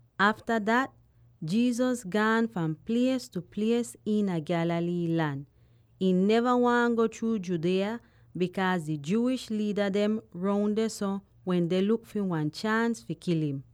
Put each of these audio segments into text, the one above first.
Afta dat, Jesus gaan fahn plies tu plies iina Galilee lan. Ihn neva waahn go chruu Judea, bikaaz di Jewish liida dem roun dehso wende luk fi wan chaans fi kil im.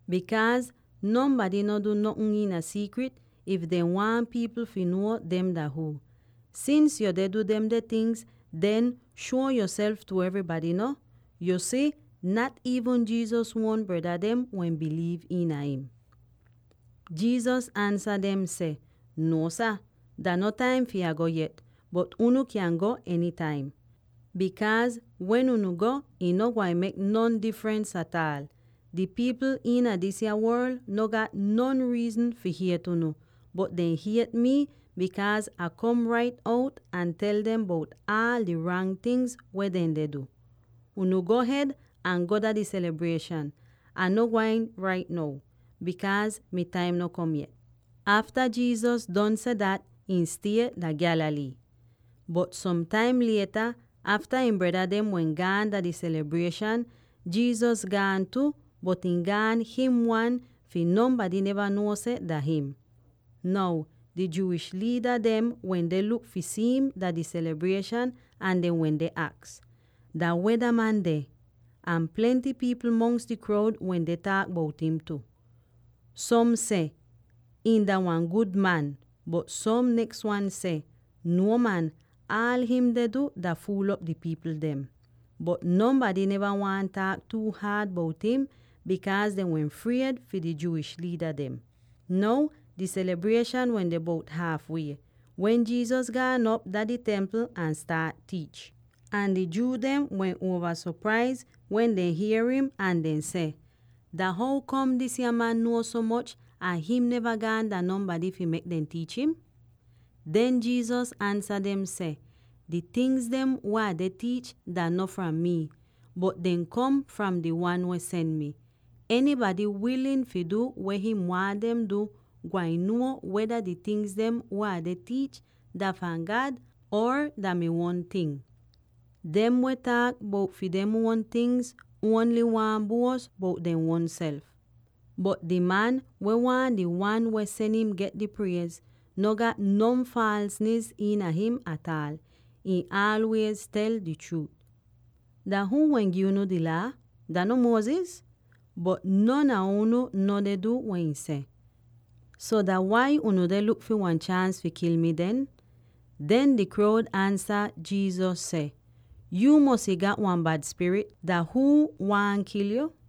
bikaaz nonbady no du notn iina siikrit, if dehn waahn pipl fi nuo dem dah huu. Sins yu deh du demde tingz, den shuo yoself tu evrybady no.” Yu si, nat iivn Jesus uon breda dem wehn biliiv iina im. Jesus ansa dem seh, “Nuo sah, dah no taim fi Ah go yet, bot unu kyan go enytaim, bikaaz wen unu go, ih no gwain mek non difrens ataal. Di pipl iina disya worl no gat non riizn fi hiet unu, bot dehn hiet mii, bikaaz Ah kom rait out ahn tel dem bout aal di rang tingz weh dehn deh du. Unu go hed ahn go dah di selibrieshan. Ah no gwain rait now, bikaaz mi taim no kom yet.” Afta Jesus don seh dat, ihn stie dah Galilee. Bot som taim lieta, afta ihn breda dem wehn gaan dah di selibrieshan, Jesus gaan tu, bot ihn gaan him wan fi nonbady neva nuo seh dah him. Now di Jewish liida dem wende luk fi si'im dah di selibrieshan ahn dehn wende aks, “Dah weh dah man deh?” Ahn plenty pipl mongs di kroud wende taak bout im tu. Som seh, “Ihn dah wan gud man.” Bot som neks wan seh, “Nuo man, aal him deh du dah fuul'op di pipl dem!” Bot nonbady neva waahn taak tuu haad bout im, bikaaz dehn wehn fried fi di Jewish liida dem. Now, di selibrieshan wende bout haaf wie, wen Jesus gaan op dah di Templ ahn staat tiich. Ahn di Jew dem wehn uova sopraiz wen dehn hier im, ahn dehn seh, “Dah how kom disya man nuo so moch ahn him neva gaan dah nonbady fi mek dem tiich im?” Den Jesus ansa dem seh, “Di tingz weh Ah deh tiich dah no fram mii, bot dehn kom fram di Wan weh sen mi. Enybady wilin fi du weh him waahn dem fi du, gwain nuo weda di tingz dem weh Ah deh tiich dah fahn God or dah mi uon ting. Dem weh taak bout fi dem uon tingz ongl waahn buos bout dehn uonself. Bot di man, weh waahn di Wan weh sen im get di priez, no gat non faalsnis iina him ataal; ihn aalwiez tel di chruut. Dah huu wehn gi unu di Laa? Dah no Moses? Bot non a unu no deh du weh ihn seh. So dah wai unu deh luk fi wan chaans fi kil mi den?” Den di kroud ansa Jesus seh, “Yuu mosy gat wan bad spirit! Dah huu waahn kil yo?”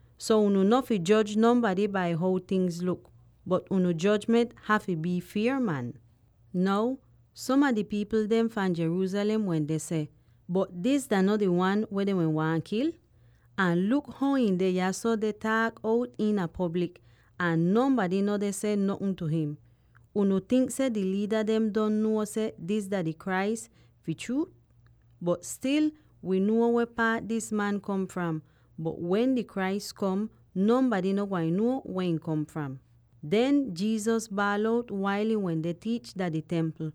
“So unu no fi joj nonbady bai how tingz luk, bot unu jojment hafy bii fier man!” Now, som a di pipl dem fahn Jerusalem wende seh, “Bot dis dah no di man weh dehn waahn kil? Ahn luk how ihn deh yahso deh taak out iina poblik, ahn nonbady no deh seh notn tu him! Unu tink seh di liida dem don nuo seh dis dah di Christ, fi chruut? Bot stil wii nuo weh paat dis man kom fram; bot wen di Christ kom, nonbady no gwain nuo weh ihn kom fram.” Den Jesus baal out wail ihn wende tiich dah di Templ: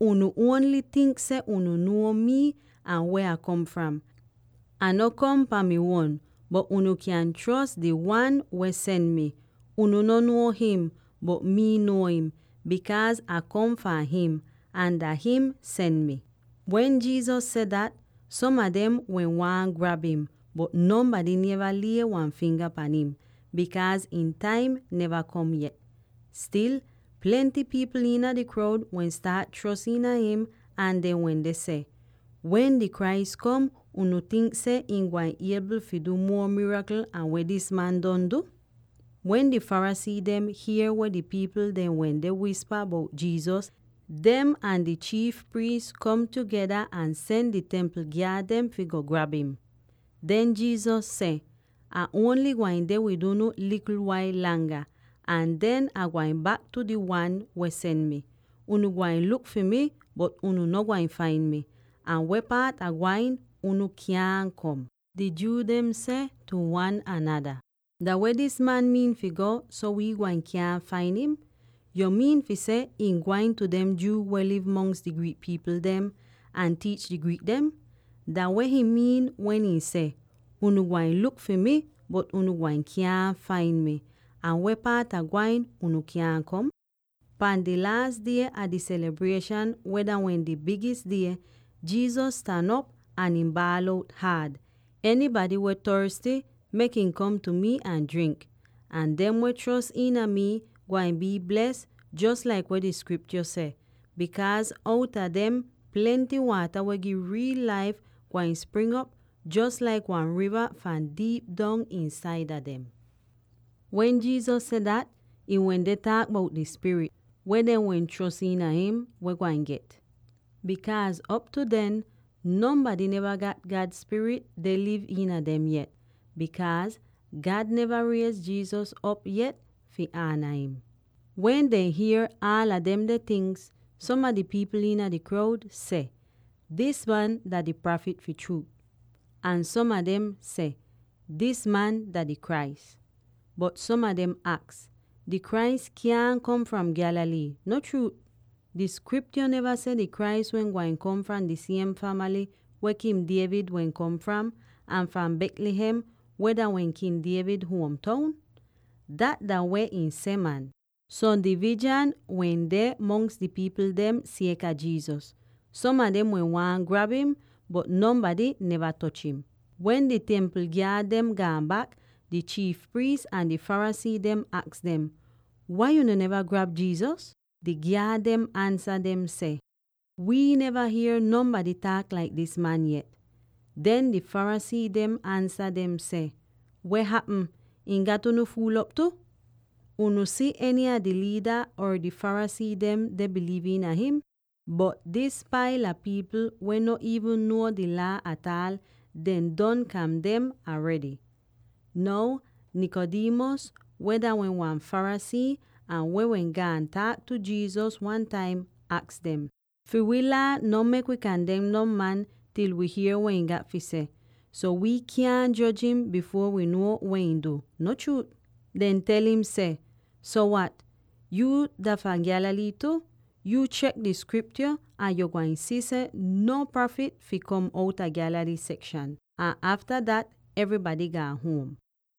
“Unu ongl tink seh unu nuo mii ahn weh Ah kom fram! Ah no kom pahn mi uon, bot unu kyan chros di Wan weh sen mi! Unu no nuo him, bot mii nuo im, bikaaz Ah kom fahn him, ahn dah him sen mi!” Wen Jesus seh dat, som a dem wehn waahn grab im, bot nonbady neva lie wan finga pan im, bikaaz ihn taim neva kom yet. Stil, plenty pipl iina di kroud wehn staat chros iina him ahn dehn wende seh, “Wen di Christ kom, unu tink seh ihn gwain iebl fi du muo mirakl an weh dis man don du?” Wen di Pharisee dehn hier weh di pipl dem wende wispa bout Jesus, dem ahn di chiif priis kom tugeda ahn sen di Templ gyaad dem fi go grab im. Den Jesus seh, “Ah ongl gwain deh wid unu likl wail langa, ahn den Ah gwain bak tu di Wan weh sen mi. Unu gwain luk fi mi, bot unu no gwain fain mi; ahn weh paat Ah gwain, unu kyaahn kom.” Di Jew dehn seh tu wan anada, “Dah weh dis man miin fi go, so wii gwain kyaahn fain im? Yu miin fi seh ihn gwain tu dem Jew weh liv mongs di Greek pipl dem, ahn tiich di Greek dem? Dah weh him miin wen ihn seh, ‘Unu gwain luk fi mi, bot unu gwain kyaahn fain mi,’ ahn ‘Weh paat Ah gwain, unu kyaahn kom’?” Pahn di laas die a di selibrieshan weh dah wehn di bigis die, Jesus stan op ahn ihn baal out haad: “Enybady weh torsty, mek ihn kom tu mi ahn jrink! Ahn dem weh chros iina mii gwain bii bles jos laik weh di Skriptyo seh, bikaaz outa dem plenty waata weh gi riil laif gwain spring'op jos laik wan riva fahn diip dong iinsaida dem!” Wen Jesus seh dat, ihn wende taak bout di Spirit, weh dem weh chros iina him wehn gwain get; bikaaz op tu den, nonbady neva gat God Spirit deh liv iina dem yet, bikaaz God neva riez Jesus op yet, fi ana him. Wen dehn hier aala demde tingz, som a di pipl iina di kroud seh, “Dis man dah di Prafit fi chruut!” Ahn som a dem seh, “Dis man dah di Christ!” Bot som a dem aks, “Di Christ kyaahn kom fahn Galilee, no chruut? Di Skriptyo neva seh di Christ wehn gwain kom fahn di siem famaly weh King David wehn kom fram, ahn fahn Bethlehem, weh dah wehn King David huom toun? Dat dah weh ih seh, man!” So divizhan wehn deh mongs di pipl dem sieka Jesus. Som a dem wehn waahn grab im, bot nonbady neva toch im. Wen di Templ gyaad dehn gaan bak, di chiif priis ahn di Pharisee dem aks dem, “Wai unu neva grab Jesus?” Di gyaad dehn ansa dem seh, “Wii neva hier nonbady taak laik dis man yet!” Den di Pharisee dehn ansa dem seh, “Weh hapm; ihn gat unu fuul'op tu? Unu si eny a di liida or di Pharisee dem deh biliiv iina him? Bot dis paila pipl, weh no iivn nuo di Laa ataal, dem don kandem aredy!” Now Nicodemus, weh dah wehn wan Pharisee, ahn weh wehn gaan taak tu Jesus wan taim, aks dem, “Fi wii Laa no mek wi kandem non man til wi hier weh ihn gat fi seh. So, wi kyaahn joj im bifuor wi nuo weh ihn du, no chruut?” Dehn tel im seh, “So wat, yuu dah fahn Galilee tu? Yuu chek di Skriptyo, ahn yo gwain si seh no prafit fi kom outa Galilee sekshan.” [Ahn afta dat, evrybady gaan huom.]